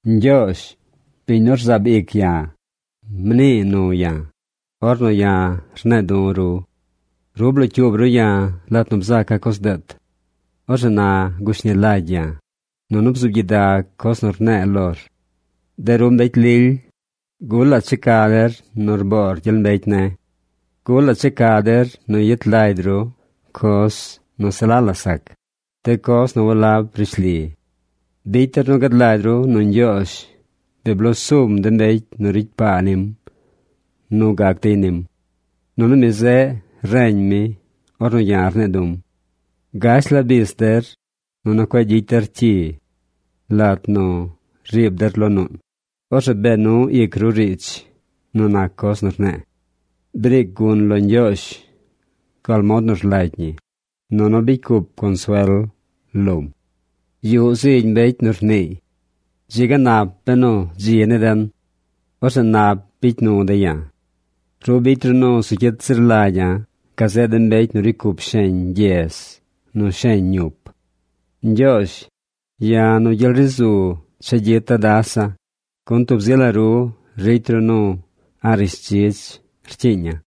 Ñgyoozh, biñ nu rzaab ic ya̱, mnii nu ya̱, ornu ya̱ rne̱e̱ du̱ ru. Ru blocyuub ru ya̱ lat nu bzaca̱ coz deet. Orzeꞌ na gushni lagy ya̱, nunu bzuub gyidag coz nu rne̱e̱ lor. De ru mbecy lily, ¿gulaꞌ checa der nu rboor gyel mbecy ne̱? ¿Gulaꞌ checa der nu yet lagy ru coz nu se la la sac, de coz nu walab rishli? Bicy der nu gad lagy ru nu Ñgyoozh bi bloo sum de mbecy nu ricy paa nim nu gac dey nim. Nunu mi zeꞌ reñ mi ornu ya̱ rne̱e̱ du̱m. Gash la bis der, nunu cueꞌ gyicy der cyi. Lat nu riib ri der lo nuun, orzeꞌ bee nu ic ru riidz nu nac coz nu rne̱e̱. Briic gun lo Ñgyoozh gal mod nu rlagy ñi, nunu bicy cup consuel lom. Yuꞌ zigy mbecy nu rniiy: “Dzi ga nap benu dzi ni den. Orzeꞌ nap bicy nu de̱ ya̱.” Ru bicy ru nu zu cyit zir lagya̱ gazeꞌ de mbecy nu ricy cup sheñ gyez nu sheñ ñup. Ñgyoozh, ya̱ nu gyel ri zu chegyita̱ dasa̱, gun tub zi la ru ricy ru nu a̱ꞌ rishdzidz rcyiiña̱.